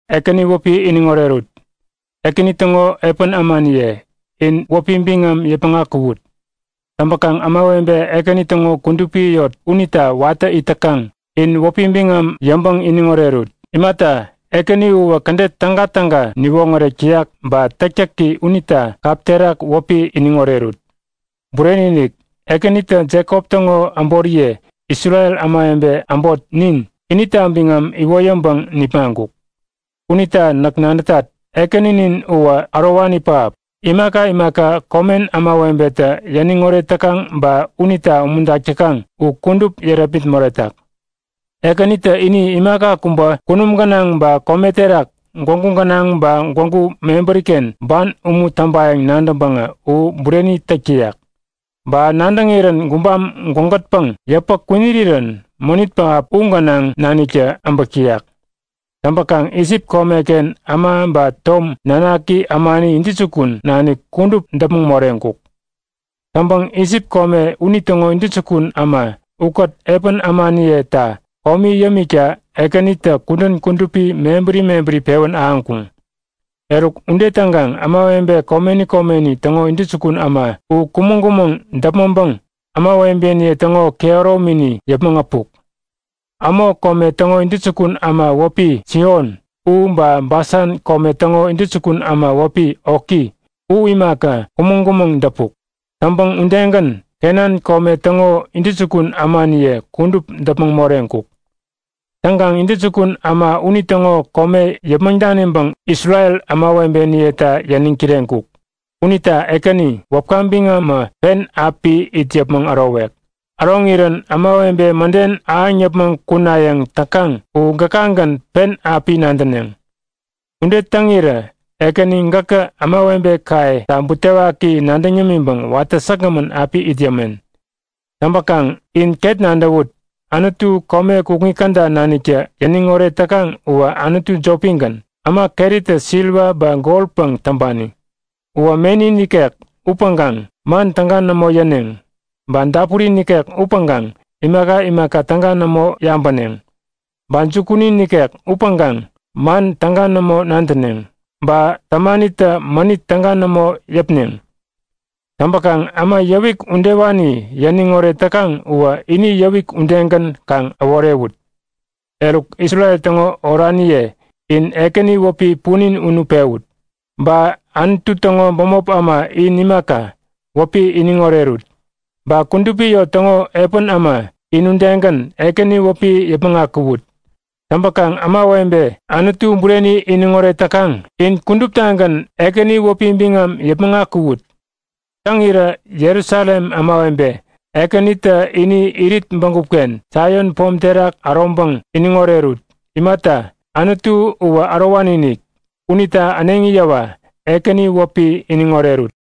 Ekäni wäpi iniŋ orerut! Ekäni täŋo epän ämaniye, in wäpi biŋam yäpmäŋ akuwut! Täŋpäkaŋ ämawebe Ekäni täŋo kudupi yot unita watä it täkaŋ, in wäpi biŋam yäŋpäŋ iniŋ orerut. Imata, Ekäni uwä kädet tägatäga niwoŋärek täyak ba täktäki unita kap terak wäpi iniŋ orerut! Bureni-inik! Ekänitä Jekop täŋo äboriye, Isrel ämawebe äbot nin, inita biŋam iwoyäŋpäŋ nipmaŋkuk. Unita näk nadätat; Ekäninin uwä ärowani pähap, imaka imaka komen ämawebetä yäniŋ oret täkaŋ ba unita umuntak täkaŋ u kudup yärepmit moretak. Ekänitä ini imaka kubä kunum gänaŋ ba kome terak, gwägu gänaŋ ba gwägu mebäriken ban umu täŋpayäŋ nadäŋpäŋä u bureni täk täyak. Ba nadäŋirän gubam gwägätpäŋ yäpä kwinirirän mänit pähap u gänaŋ naniktä äbäk täyak. Täŋpäkaŋ Isip komeken äma ba tom nanaki ämani intäjukun nanik kudup däpmäŋ moreŋkuk. Täŋpäŋ Isip kome unitäŋo intäjukun äma ukät epän ämaniyeta komi yämikta Ekänitä kudän kudupi mebäri mebäri pewän ahäŋkuŋ. Eruk ude täŋkaŋ ämawebe komeni komeni täŋo intäjukun äma u kumäŋ-kumäŋ däpmäŋpäŋ ämawebeniye täŋo kehäromini yäpmäŋ äpuk. Amo kome täŋo intäjukun äma wäpi Sihon u ba Basan kome täŋo intäjukun äma wäpi Oki u imaka kumäŋ-kumäŋ däpuk. Täŋpäŋ udegän Kenan kome täŋo intäjukun ämaniye kudup däpmäŋ moreŋkuk. Täŋkaŋ intäjukun äma unitäŋo kome yäpmäŋ daniŋpäŋ Isrel ämawebeniyeta yäniŋ kireŋkuk. Unita Ekäni, wäpka biŋamä pen api it yäpmäŋ ärowek. Äroŋirän ämawebe mäden ahäŋ yäpmäŋ kunayäŋ täkaŋ u gäkagän pen api nadäneŋ. Ude täŋirä Ekäni gäkä ämawebekayeta butewaki nadäŋ yämiŋpäŋ watä säkgämän api it yämen. Täŋpäkaŋ in ket nadäwut; Anutu kome kukŋi käda naniktä yäniŋ oret täkaŋ uwä anutu jopigän, äma keritä siliwa ba goräpäŋ täŋpani. Uwä meni nikek upäŋkaŋ man täga nämo yäneŋ. Ba dapuri nikek upäŋkaŋ imaka imaka täga nämo yabäneŋ. Ba jukuni nikek upäŋkaŋ man täga nämo nadäneŋ. Ba tämanitä mänit täga nämo yäpneŋ. Täŋpäkaŋ äma yäwik udewani yäniŋ oret täkaŋ uwä ini yäwik udegän kaŋ äworewut! Eruk, Isrel täŋo oraniye in Ekäni wäpi punin unu pewut! Ba Anutu täŋo bämop äma in imaka, wäpi iniŋ orerut. Ba kudupi yot täŋo epän äma, in udegän, Ekäni wäpi yäpmäŋ akuwut! Täŋpäkaŋ ämawebe Anutu bureni iniŋoret täkaŋ, in kuduptagän Ekäni wäpi biŋam yäpmäŋ akuwut! Täŋirä Jerusalem ämawebe, Ekänitä ini irit bägupken, Saion pom terak äroŋpäŋ iniŋ orerut. Imata, Anutu uwä ärowani-inik. Unita äneŋi yäwa, Ekäni wäpi iniŋ orerut!